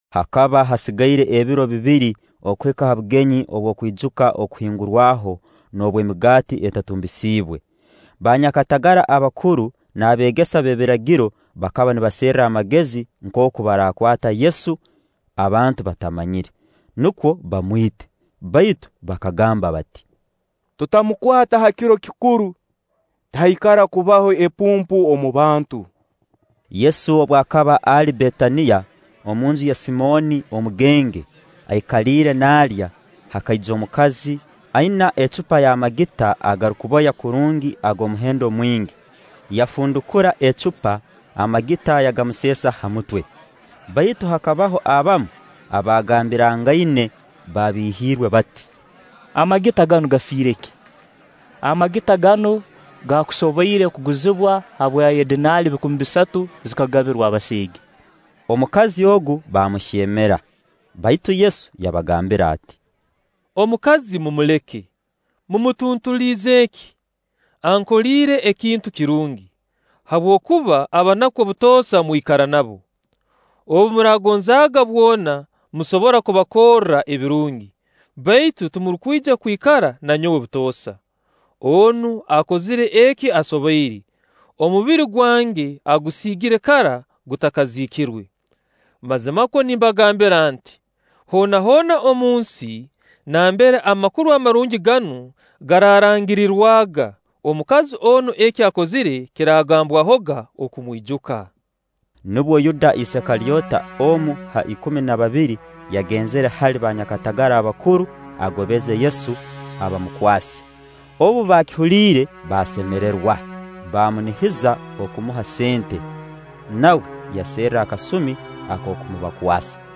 Hakaba hasigaire ebiro bibiri okuhika ha bugenyi bw'okwijuka Okuhingurwaho n'obw'Emigaati Etatumbisiibwe. Baanyakatagara abakuru n'abeegesa b'ebiragiro bakaba nibaserra amagezi nkooku baraakwata Yesu abantu batamanyire, nukwo bamwite; baitu bakagamba bati: “Tutamukwata ha kiro kikuru, tihaikara kubaho epumpu omu bantu.” Yesu obu akaba ali Betaniya, omunju ya Simooni omugenge, aikaliire naalya, hakaija omukazi aina ihembe ly'amagita agarukuboya kurungi ag'omuhendo mwingi, yafundukura ihembe, amagita yagamuseesa ha mutwe. Baitu hakabaho abamu abagambirangaine babiihirwe bati: “Amagita ganu gafiire ki? Amagita ganu gaakusoboire kuguzibwa habwa edinaali bikumi bisatu, zigabirwa abaseege.” Omukazi ogu baamuhyemera. Baitu Yesu yabagambira ati: “Omukazi mumuleke; mumutuntuliize ki? Ankoliire ekintu kirungi. Habwokuba abanaku obutoosa mwikara nabo. Obu muraagonzaaga bwona, musobora kubakorra ebirungi; baitu timurukwija kwikara na nyowe butoosa. Onu akozire eki asoboire; omubiri gwange agusiigire kara gutakaziikirwe. Mazimakwo nimbagambira nti: Hoona hoona omunsi nambere Amakuru Amarungi ganu garaarangirirwaga, omukazi onu eki akozire kiraagambwahoga okumwijuka.” Nubwo Yuda Isikalyota, omu ha ikumi na babiri yagenzire hali banyakatagara abakuru agobeze Yesu abamukwase. Obu baakihuliire baasemererwa, baamunihiza kumuha sente. Nawe yaserra akasumi ak'okumubakwasa.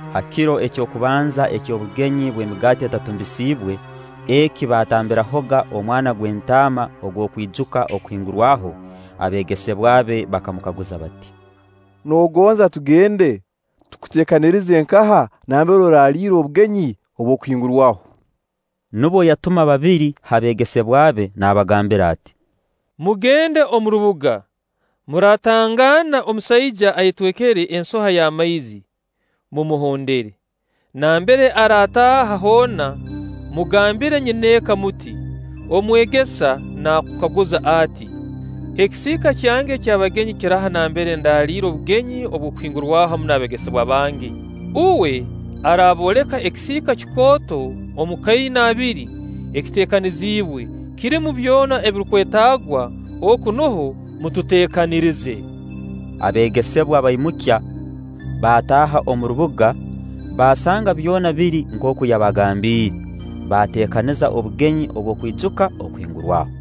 Ha kiro eky'okubanza eky'obugenyi bw'Emigaati Etatumbisiibwe, eki baatambirahoga omwana gw'entaama ogw'okwijuka Okuhingurwaho, abeegesebwa be bakamukaguza bati: “Noogonza tugende tukuteekanirize nkaha, nambere oraliira obugenyi obw'Okuhingurwaho?” Nubwo yatuma babiri ha beegesebwa be, nabagambira ati: “Mugende omu rubuga, muraatangaana omusaija ayetwekere ensoha y'amaizi; mumuhondere. Nambere araataaha hoona, mugambire nyineeka muti: ‘Omwegesa naakukaguza ati: Ekisiika kyange eky'abagenyi kiraha nambere ndaaliira obugenyi obw'Okuhingurwaho hamu n'abeegesebwa bange?’ Uwe araabooleka ekisiika kikooto omu kainaabiri ekiteekaniziibwe, kirumu byona ebirukwetaagwa; oku nuho mututeekanirize.” Abeegesebwa baimukya, baataaha omu rubuga, baasanga byona biri nkooku yabagambiire; baateekaniza obugenyi obw'okwijuka Okuhingurwaho.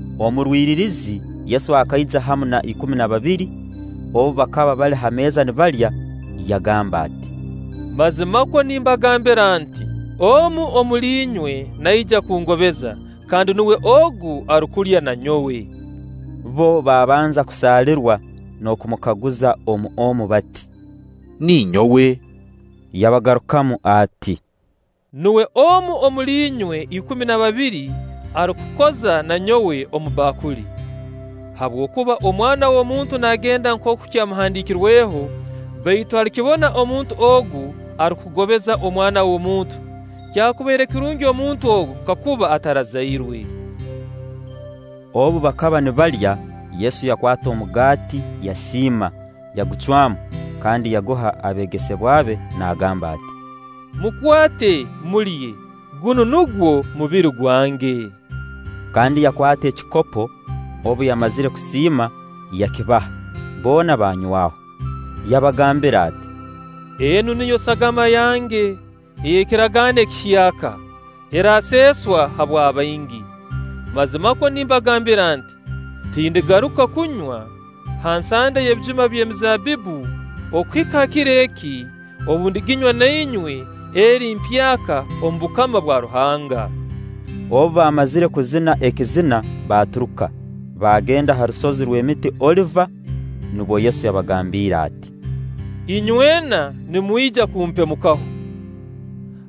Omu rwiririzi Yesu akaija hamu na ikumi na babiri. Obu bakaba bali ha meeza nibalya, yagamba ati: “Mazimakwo nimbagambira nti: Omu omuli inywe naija kungobeza, kandi nuwe ogu arukulya na nyowe.” Bbo baabanza kusaalirwa n'okumukaguza omu omu bati: “Ninyowe?” Yabagarukamu ati: “Nuwe omu omuli inywe ikumi na babiri arukukoza na nyowe omu bbakuli. Habwokuba Omwana w'omuntu naagenda nkooku kyamuhandiikirweho, baitu alikibona omuntu ogu arukugobeza Omwana w'omuntu! Kyakubaire kirungi omuntu ogu kakuba atarazairwe.” Obu bakaba nibalya, Yesu yakwata omugaati yasiima, yagucwamu, kandi yaguha abeegesebwa be naagamba ati: “Mukwate, mulye, gunu nugwo mubiri gwange.” Kandi yakwata ekikopo, obu yamazire kusiima, yakibaha; boona baanywaho. Yabagambira ati: “Enu niyo sagama yange ey'ekiragaano ekihyaka, eraaseeswa habwa baingi. Mazimakwo nimbagambira nti: Tindigaruka kunywa ha nsande ey'ebijuma by'emizaabbibbu okuhika ha kiro eki, obu ndiginywa na inywe eri mpyaka omu bukama bwa Ruhanga.” Obu baamazire kuzina ekizina baaturuka, baagenda ha rusozi rw'emiti Oliva. Nubwo Yesu yabagambiire ati: “Inywena nimwija kumpemukaho;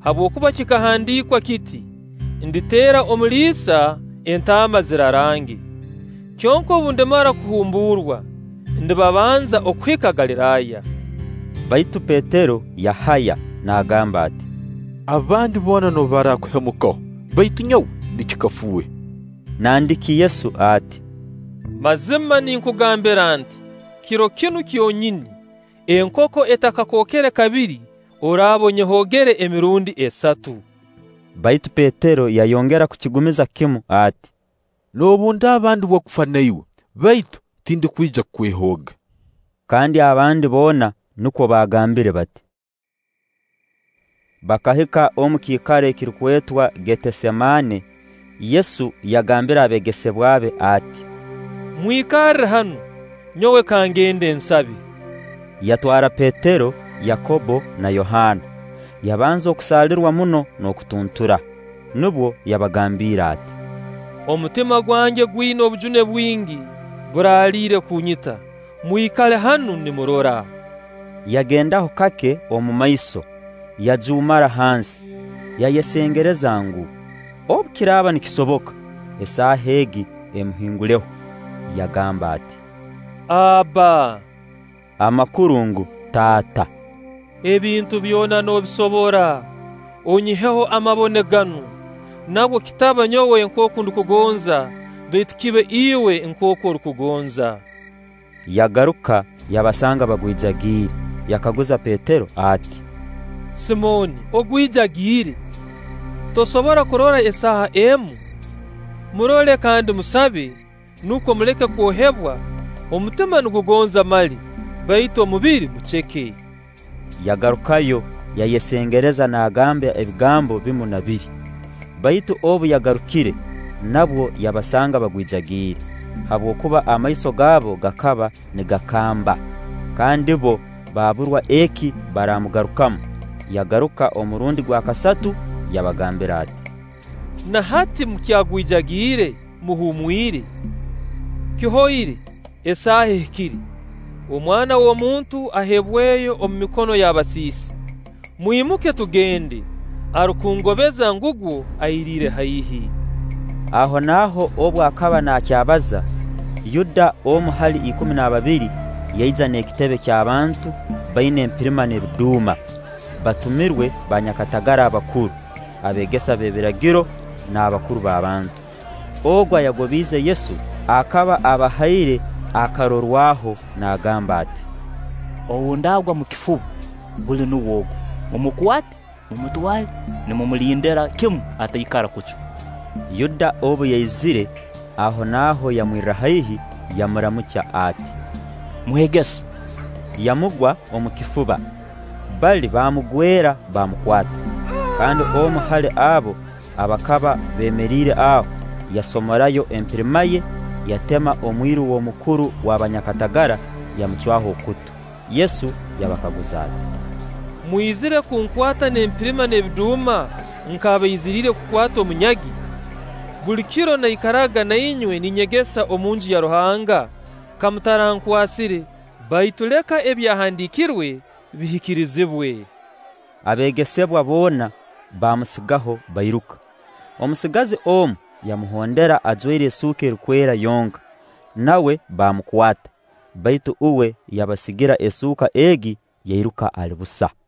habwokuba kikahandiikwa kiti: ‘Nditeera omuliisa, entaama zirarange.’ Kyonka obu ndimara kuhumburwa, ndibabanza okuhika Galiraaya.” Baitu Petero yahaya naagamba ati: “Abandi boona noobu baraakuhemukaho, baitu nyowe ninkifuuhya!” Nandiki Yesu ati: “Mazima ninkugambira nti: Kiro kinu kyonyini, enkoko etakakookere kabiri, oraaba onyehoogere emirundi esatu.” Baitu Petero yayongera kukigumiza kimu ati: “Noobu ndaaba ndi w'okufa na iwe, baitu tindukwija kukwehooga.” Kandi abandi boona nukwo baagambire bati. Bakahika omu kiikaro ekirukwetwa Getesemaane. Yesu yagambira abeegesebwa be ati: “Mwikarre hanu, nyowe kangende nsabe.” Yatwara Petero, Yakobbo, na Yohaana; yabanza kusaalirwa muno n'okutuntura. Nubwo yabagambiire ati: “Omutima gwange gwina obujune bwingi, buraaliire kunyita. Mwikale hanu nimurora.” Yagendaho kake omu maiso, yajuumara hansi, yayesengereza ngu, obu kiraaba nikisoboka, esaaha egi emuhinguleho. Yagamba ati: “Abba”, amakuru ngu, Taata. “Ebintu byona noobisobora; onyiheho amabone ganu; nabwo kitaba nyowe nkooku ndukugonza, baitu kibe Iwe nkooku orukugonza.” Yagaruka yabasanga bagwijagiire, yakaguza Petero ati: “Simooni ogwijagiire? Tosoboire kurora esaaha emu? Murole kandi musabe, nukwo muleke kwohebwa; omutima nigugonza mali, baitu omubiri muceke.” Yagarukayo yayesengereza naagamba ebigambo bimu na biri. Baitu obu yagarukire, nabwo yabasanga bagwijagiire, habwokuba amaiso gaabo gakaba nigakamba. Kandi bbo baaburwa eki baramugarukamu. Yagaruka omurundi gwa kasatu, yabagambira ati: “Na hati mukyagwijagiire, muhumwire? Kihoire; esaaha ehikire; Omwana w'omuntu aheebweyo omu mikono y'abasiisi. Mwimuke tugende; arukungobeza ngugwo, airiire haihi.” Ahonaaho obu akaba naakyabaza, Yuda, omu hali ikumi na babiri, yaija n'ekitebe ky'abantu baina empirima n'ebiduuma, batumirwe baanyakatagara abakuru, abeegesa b'ebiragiro n'abakuru b'abantu. Ogu ayagobiize Yesu akaba abahaire akarorwaho naagamba ati: “Ou ndaagwa omu kifuba, buli nuwe ogu; mumukwate, mumutwale nimumulindira kimu ataikara kucwa.” Yuda obu yaizire, ahonaaho yamwirra haihi, yamuramukya ati: “Mwegesa!” Yamugwa omu kifuba. Bali baamugwera, baamukwata. Kandi omu hali abo abakaba beemeriire aho, yasomorayo empirima ye, yatema omwiru w'omukuru w'abanyakatagara, yamucwaho okutu. Yesu yabakaguza ati: “Mwizire kunkwata n'empirima n'ebiduuma nk'abaiziriire kukwata omunyagi? Buli kiro naikaraga na inywe ninyegesa omu Nju ya Ruhanga, ka mutarankwasire. Baitu leka Ebyahandiikirwe bihikirizibwe.” Abeegesebwa boona baamusigaho, bairuka. Omusigazi omu yamuhondera ajwaire esuuka erukwera yonka; nawe bamukwata; baitu uwe yabasigira esuuka egi, yairuka ali busa.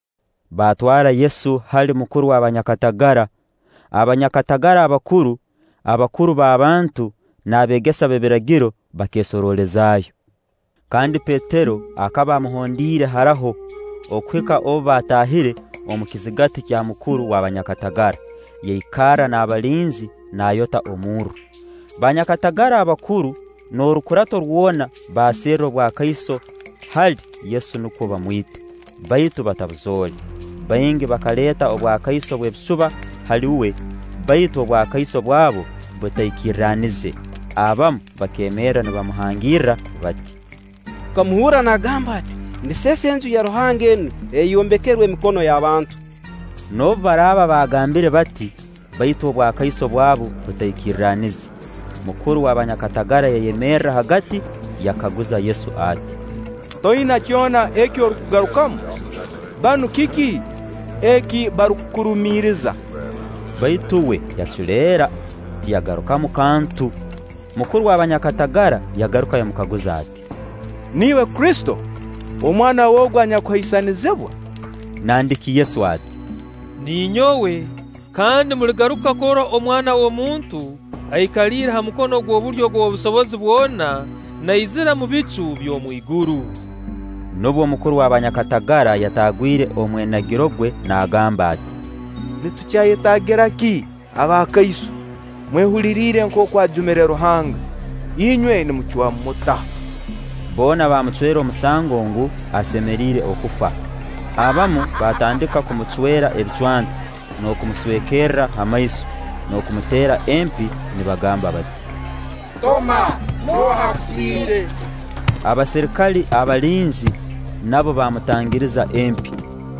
Baatwara Yesu hali mukuru w'abanyakatagara. Abanyakatagara abakuru, abakuru b'abantu, n'abeegesa b'ebiragiro bakeesoroolezaayo. Kandi Petero akaba amuhondiire haraho, okuhika obu baataahire omu kizigati kya mukuru w'abanyakatagara; yaikarra n'abalinzi nayota omurro. Baanyakatagara abakuru n'orukurato rwona baaserra obwakaiso hali Yesu nukwo bamwite; baitu batabuzoole. Baingi bakaleeta obwakaiso bw'ebisuba hali uwe, baitu obwakaiso bwabo butaikirranize. Abamu bakeemerra nibamuhangirra bati: “Tukamuhurra naagamba ati: ‘Ndiseesa Enju ya Ruhanga enu eyayombekerwe emikono y'abantu.’” Noobu baraaba baagambire bati, baitu obwakaiso bwabo butaikirranize. Mukuru w'abanyakatagara yayemerra hagati, yakaguza Yesu ati: “Toina kyona eki orukugarukamu? Banu kiki eki barukukurumiriza?” Baitu uwe yaculeera, tiyagarukamu kantu. Mukuru w'abanyakatagara yagaruka yamukaguza ati: “Niiwe Kristo, Omwana w'Ogu Anyakuhaisanizibwa?” Nandiki Yesu ati: “Ninyowe; kandi muligaruka kurora Omwana w'omuntu aikaliire ha mukono gw'obulyo ogw'Ow'Obusobozi bwona, naizira omu bicu by'omu iguru.” Nubwo Mukuru w'abanyakatagara yataagwire omwenagiro gwe naagamba ati: “Nitukyayetaagira ki abakaiso? Mumwehuliriire nkooku ajumire Ruhanga. Inywe nimucwamu muta?” Boona baamucwera omusango ngu, asemeriire okufa. Abamu baatandika kumucwera ebicwanta, n'okumuswekerra ha maiso, n'okumuteera empi nibagamba bati: “Toma, nooha akutiire!” Abaserikale abalinzi nabo baamutangiriza empi.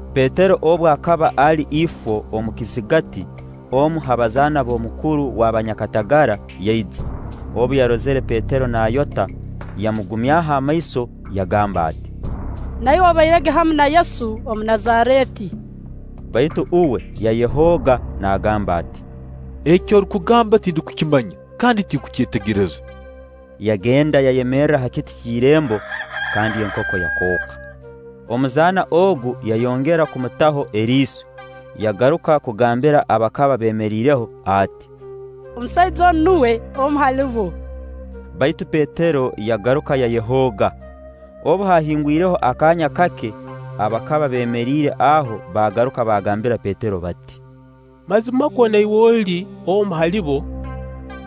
Petero obu akaba ali ifo omu kizigati, omu ha bazaana b'omukuru w'abanyakatagara yaija. Obu yarozire Petero naayota, yamugumyaho amaiso yagamba ati: “Na iwe obairege hamu na Yesu Omunazareeti.” Baitu uwe yayehooga naagamba ati: “Eki orukugamba tindukukimanya kandi tindukukyetegereza.” Yagenda yayemerra ha kiti ky'irembo, kandi enkoko yakooka. Omuzaana ogu yayongera kumutaho eriiso, yagaruka kugambira abakaba beemeriireho ati: “Omusaija onu nuwe omu hali bo.” Baitu Petero yagaruka yayehooga. Obu haahingwireho akaanya kake, abakaba beemeriire aho baagaruka baagambira Petero bati: “Mazimakwo na iwe oli omu hali bo,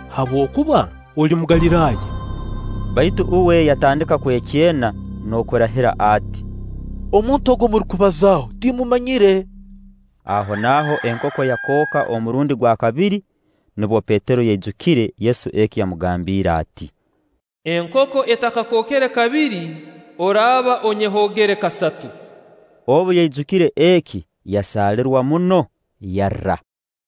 habwokuba oli Mugaliraaya.” Baitu uwe yatandika kwekyena n'okurahira ati: “Omuntu ogu ou murukubazaaho, timmumanyire.” Ahonaaho enkoko yakooka omurundi gwa kabiri. Nubwo Petero yaijukire Yesu eki yamugambiire ati: “Enkoko etakakookere kabiri, oraaba onyehoogere kasatu.” Obu yaijukire eki, yasaalirwa muno, yarra.